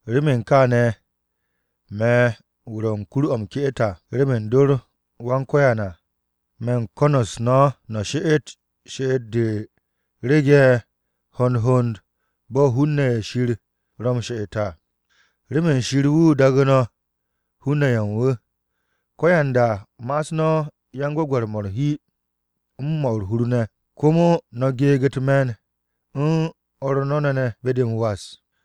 Remen kaane̱, me̱ wu̱ ro̱ u̱n kur-o̱ m-ke'et à, remen dor Wan-Ko̱yan à. Me̱ u̱n ko̱n-u̱s no̱ no̱ she'et she'et-de rege̱ hond hond bo̱ hun-ne̱ ye̱ Shir ro̱ m-she'et à, remen Shir wu̱ daagu̱ no̱ hun-ne̱ ye̱ u̱n wu̱. Ko̱yanda ma'as no̱ yan-gwe̱gwe̱r-mo̱ u̱r-hi, u̱n 'mo̱ u̱r-hur ne̱, komo no̱ geeg u̱t-me̱n u̱n o̱r no̱ ne̱ ne̱ be-de m-was.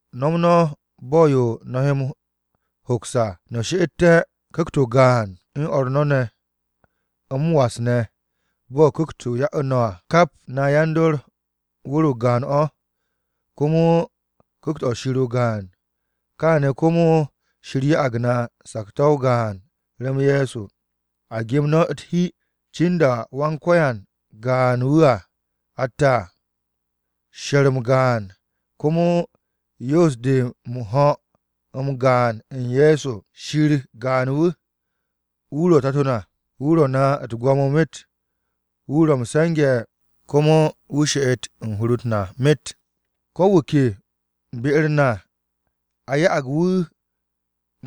No̱m no̱ bo̱ u̱n yo no̱ he m-hoks à no̱ she'ette̱ Ku̱kt-o gaan u̱n o̱r no̱ ne̱ m-was ne̱ bo̱ Ku̱kt-o ya'u̱ no̱ à. Kap na yan-dor wu̱r-o gaan-o̱, komo Ku̱kt-o Shir o-gaan. Kaane̱ komo Shir ya'ag na sakto̱-o gaan rem Ye̱so. A gem no̱ u̱t-hi cinda Wan-Ko̱yan gaan wu̱ atte̱ à, she̱r-m gaan, komo yo'os-de m-ho̱ m-gaan u̱n Ye̱so. Shir gaan-wu̱, wu̱ ro̱ Tato na. Wu̱ ro̱ na u̱t-gwo̱mo myet, wu̱ ro̱ m-se̱nge̱ be-u̱r na, komo wu̱ she'et u̱n hur-u̱t na myet. Ko wu̱ ke be-u̱r na a ya'ag wu̱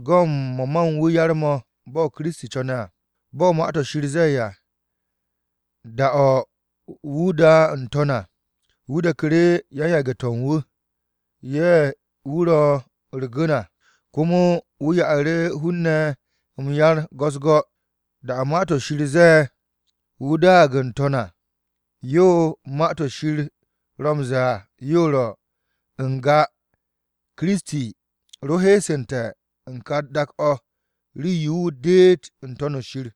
go̱ u̱n mo̱ ma u̱n wu̱ yar-mo̱ bo̱ Kiristi co̱ne̱ à. Bo̱ Ma-to̱ Shir ze̱e̱ à, “Da-o̱ wu̱ da n-to̱n à, wu̱ deku̱ru̱ yan-yage̱-to̱ u̱n wu̱, ye̱ wu̱ re u̱r-gu̱n à. Komo wu̱ ya'u̱ru̱ hun-ne̱ m-yar go̱-u̱s-go̱.” Da-o̱ Ma-to̱ Shir ze̱e̱, “Wu̱ daag n-to̱n à,” yo Ma-to̱ Shir ro m-ze̱e̱ à, yo ro̱: n-ga Kiristi ro heesu̱nte̱ u̱n ka dak-o̱ rii-yo wu̱ deet n-To̱n shir.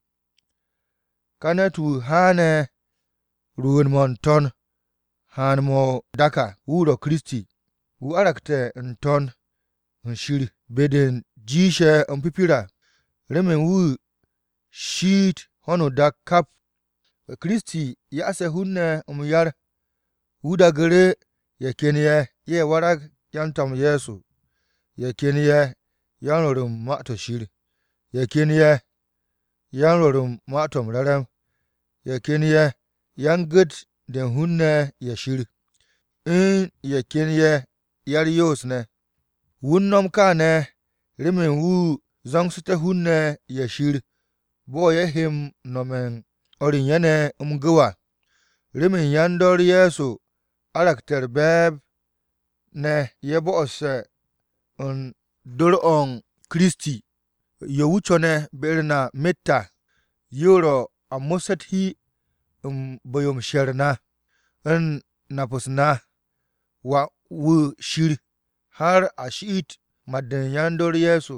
Ka ne̱t-wu̱ haane̱ rwu̱u̱n-mo̱ n-To̱n haan-mo̱ n-dak à, wu̱ ro̱ Kiristi. Wu̱ warge̱ n-To̱n shir be-de jiishe̱ m-pipir à, remen wu̱ shiit ho̱no o-dak kap. Kiristi ya'ase̱ hun-ne̱ m-yar. Wu̱ daagu̱ru̱: Ye̱ ken ye̱, ye̱ warag yan-To̱m Ye̱so, Ye̱ ken ye̱ yan-Rwo̱r u̱n Ma-to̱ Shir, Ye̱ ken ye̱ yan-Rwo̱r u̱n Ma-to̱ m-Re̱re̱m, Ye̱ ken ye̱ yan-Gu̱t-de u̱n hun-ne̱ ye̱ Shir, u̱n Ye̱ ken ye̱ ya-u̱r-Yoos ne̱. Wu̱ u̱n no̱m kaane̱ remen wu̱ zo̱ngsu̱té̱ hun-ne̱ ye̱ Shir bo̱ ye̱ he m-no̱me̱ u̱n o̱r u̱n ye̱ ne̱ m-gu̱w à, remen yan-dor Ye̱so waragté̱ u̱r-be̱e̱b ne̱ ye̱ bo̱'o̱se̱ u̱n dor-o u̱n Kiristi. Yo wu̱ co̱ne̱ be-u̱r na myet à, yo ro̱ a mo̱sse̱ u̱t-hi u̱n bu̱-yo u̱n she̱r-m na u̱n nap-se u̱n Wà-wu̱ Shir har a shiit mat-de u̱n yan-dor Ye̱so.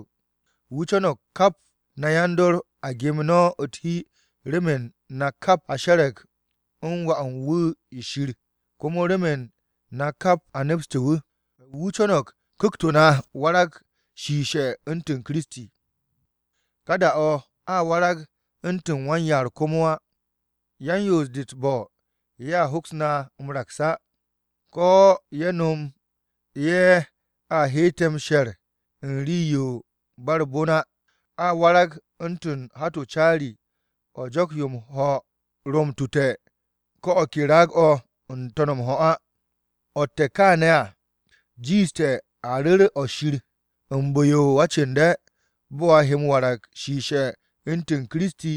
Wu̱ co̱no̱g kap na yan-dor a gem no̱ u̱t-hi remen na kap a she̱re̱g u̱n Wà-wu̱ Shir komo remen na kap a nepse̱ wu̱. Wu̱ co̱no̱g ku̱kt-o na warag shiishe̱ u̱ntu̱n Kiristi. Ka da-o̱ a warag u̱ntu̱n wan-yaar komo á. Yan-yoos-de u̱t-bo̱ ye̱a hoks na m-raks á, ko̱ ye̱ no̱m yo a hette̱ m-she̱r u̱n rii-yo u̱n ba u̱r-bon á. A warag u̱ntu̱n hat-o caari, o̱ jo̱k-ye̱ m-ho̱ ro m-tute̱ ko̱ o̱ ke raag-o̱ n-to̱n m-ho̱ á. O̱tte̱ kaane̱ à jiishte̱, a ru̱r o-nip u̱n bu̱-yo o-acu̱nde̱, bo̱ a he m-warag shiishe̱ u̱ntu̱n Kiristi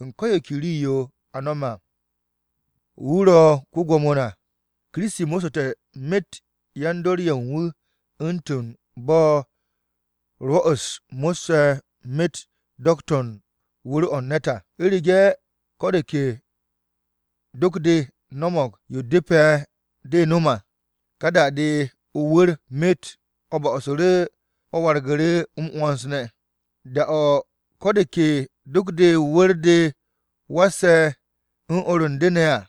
u̱n ko̱ yo ke rii-yo a m-no̱m à. Wu̱ ro̱ ko-Gwo̱mo na. Kiristi mo̱ssu̱te̱ myet yan-dor ye̱ u̱n wu̱ u̱ntu̱n bo̱ 'rwo̱-u̱s mo̱sse̱ myet do̱k-to̱ u̱n wu̱r-o̱ u̱n ne̱t à. U̱rege̱ ko̱ de ke do̱k-de no̱mo̱g yo depe̱ de no̱m à, ka da-de o-wu̱r myet o̱ bo̱'o̱su̱ru̱ o̱ waragu̱ru̱ m-'wo̱ns ne̱, da-o̱ ko̱ de ke do̱k-de o-wu̱r de wasse̱ u̱n o̱r u̱n de ne̱ à.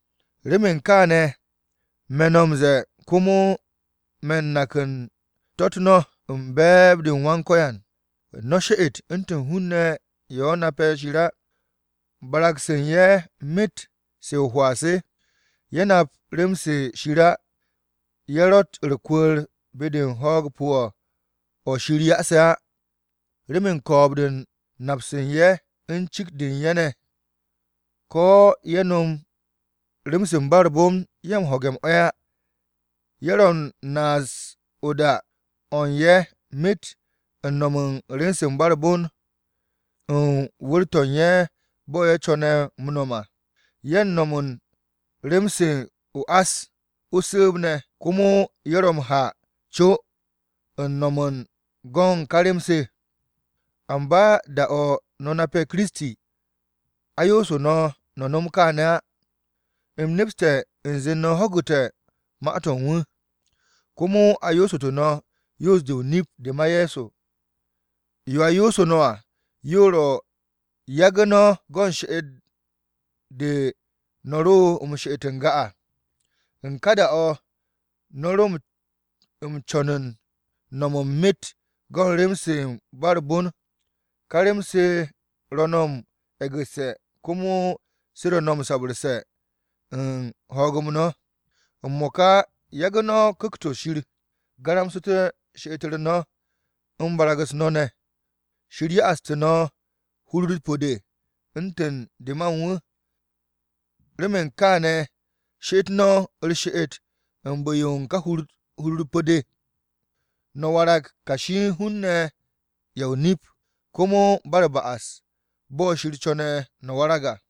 Remen kaane̱, me̱ no̱ m-ze̱e̱ komo me̱ u̱n nak u̱n to̱-u̱t no̱ u̱n be̱e̱b-de u̱n Wan-Ko̱yan: No̱ she'et u̱ntu̱n hun-ne̱ ye̱ nape̱ Shir á. Barag-se u̱n ye̱ myet se o-hwaa se. Ye̱ nap rem-se Shir á. Ye̱ ro̱tt u̱r-kwu̱ku̱r be-de u̱n ho̱o̱g pu̱-o̱ o̱ Shir ya'ase̱ á, remen ko̱o̱b-de u̱n nap-se u̱n ye̱ u̱n cikt-de u̱n ye̱ ne̱. Ko̱ ye̱ no̱m rem-se u̱n ba u̱r-bon ye̱ u̱n ho̱ge̱ m-'e̱ á. Ye̱ ro̱ u̱n naas o-da o̱ u̱n ye̱ myet u̱n no̱m u̱n rem-se u̱n ba u̱r-bon u̱n wu̱r-to̱ u̱n ye̱ bo̱ ye̱ co̱ne̱ m-no̱m à. Ye̱ u̱n no̱m u̱n rem-se o-ás o-su̱u̱b ne̱, komo ye̱ ro̱ m-ha co u̱n no̱m u̱n go̱n ka rem-se. Amba da-o̱ no̱ nape̱ Kiristi, a yoosu̱ no̱, no̱ nom kaane̱ á. U̱m nepste̱ u̱nze no̱ ho̱gu̱te̱ ma-to̱ u̱n wu̱. Komo a yoosu̱tu̱ no̱ yoos-de o-nip de ma Ye̱so. Yo a yoosu̱ no̱ à, yo ro̱ yagu̱ no̱ go̱n she'et-de no̱ ro m-she'et n-ga à. U̱n ká da-o̱ no̱ ro m-co̱n u̱n no̱m u̱n myet go̱n rem-se u̱n ba u̱r-bon. Ká rem-se ro̱ no̱ m-e̱gu̱sse̱ komo se ro̱ u̱n sabu̱rse̱ u̱n ho̱o̱g-m no̱. M-mo̱ka yagu̱ no̱ Ku̱kt-o Shir garamsu̱te̱ she'et-u̱r no̱ u̱n barag-u̱s no̱ ne̱. Shir ya'astu̱ no̱ hur-u̱r pu̱-de u̱ntu̱n de ma u̱n wu̱. Remen kaane̱ she'et no̱ u̱r-she'et u̱n bu̱-yo u̱n ka hur-u̱r pu̱-de de, no̱ warag kashi u̱n hun-ne̱ ye̱ o-nip komo ba u̱r-ba'as bo̱ Shir co̱ne̱ no̱ warag à.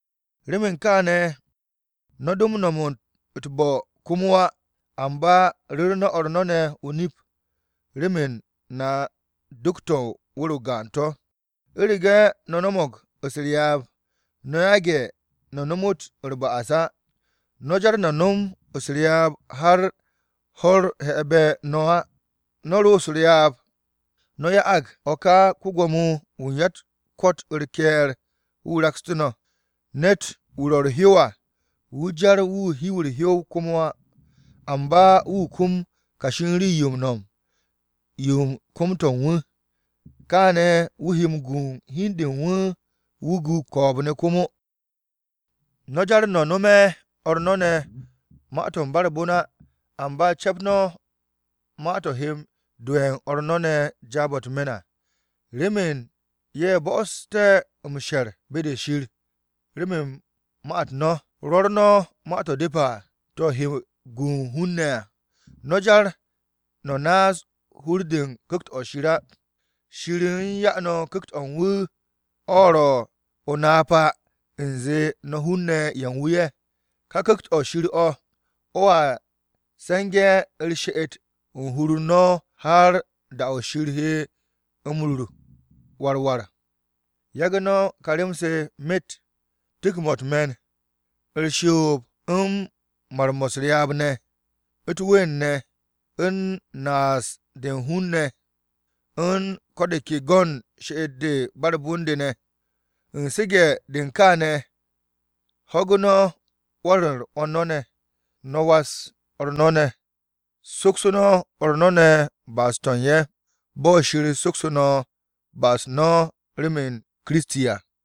Remen kaane̱, no̱ do no̱m u̱t-bo̱ komo á. Amba ru̱ru̱ no̱ o̱r no̱ ne̱ o-nip, remen na do̱k-to̱ u̱n wu̱r-o gaan to̱. U̱rege̱ “no̱ no̱mo̱g u̱s-ryaab, no̱ yage̱ no̱ nomot u̱r-ba'as á.” No̱ jar no̱ no̱m u̱s-ryaab har ho̱-u̱r hebe no̱ á. No̱ ro̱ u̱s-ryaab, no̱ ya'ag o̱ ka ko-Gwo̱mo-wu̱ u̱n ya-u̱t-ko̱t u̱r-ke̱e̱r wu̱ rakstu̱ no̱. Ne̱t-wu̱ ro̱ u̱r-hyow à, wu̱ jar wu̱ do hiw u̱r-hyow komo á. Amba wu̱ kum kashi u̱n rii-yo m-no̱m yo u̱n kom-to̱ u̱n wu̱. Kaane̱ wu̱ he m-gu hi u̱n de u̱n wu̱, wu̱ gu ko̱o̱b-ne̱ komo. No̱ jar no̱ no̱me̱ o̱r no̱ ma-to̱ u̱n ba u̱r-bon á. Amba cep no̱ ma-to̱ he m-do'e̱ o̱r no̱ ne̱ jaab-o̱ u̱t-me̱n à, remen ye̱ bo'osu̱té̱ m-she̱r ne̱ be-de Shir remen ma-u̱t u̱n no̱. Rwo̱r no̱ ma-to̱ depe̱ à, to̱ he gu u̱n hun-ne̱ à. No̱ jar no̱ naas hur-de u̱n Ku̱kt-o̱ Shir á. Shir u̱n 'ya no̱ Ku̱kt-o̱ u̱n wu̱ o̱ ro̱ o-napa u̱nze no̱ hun-ne̱ ye̱ u̱n wu̱ ye̱. Ka Ku̱kt-o̱ Shir o̱ o̱a se̱nge̱ u̱r-she'et u̱n hur u̱n no̱ har da-o̱ Shir he no̱ m-rur war war à. Yagu̱ no̱ ka rem-se myet: Tu̱k-mo̱ u̱t-me̱n, U̱r-shoos ne̱, u̱n Mar-mo̱ u̱s-ryaab ne̱, U̱t-ween ne̱, u̱n Naas-de u̱n hun-ne̱ ne̱, u̱n Ko̱ de ke go̱n she'et-de ba u̱r-bon de ne̱. U̱n su̱ge̱-de u̱n kaane̱, ho̱gu̱ no̱ 'wo̱n-u̱r o̱r no̱ ne̱, no̱ was o̱r no̱ ne̱. Soksu̱ no̱ o̱r no̱ ne̱ ba'as-to̱ u̱n ye̱, bo̱ Shir soksu̱ no̱ ba'as-u̱t no̱ rem Kiristi à.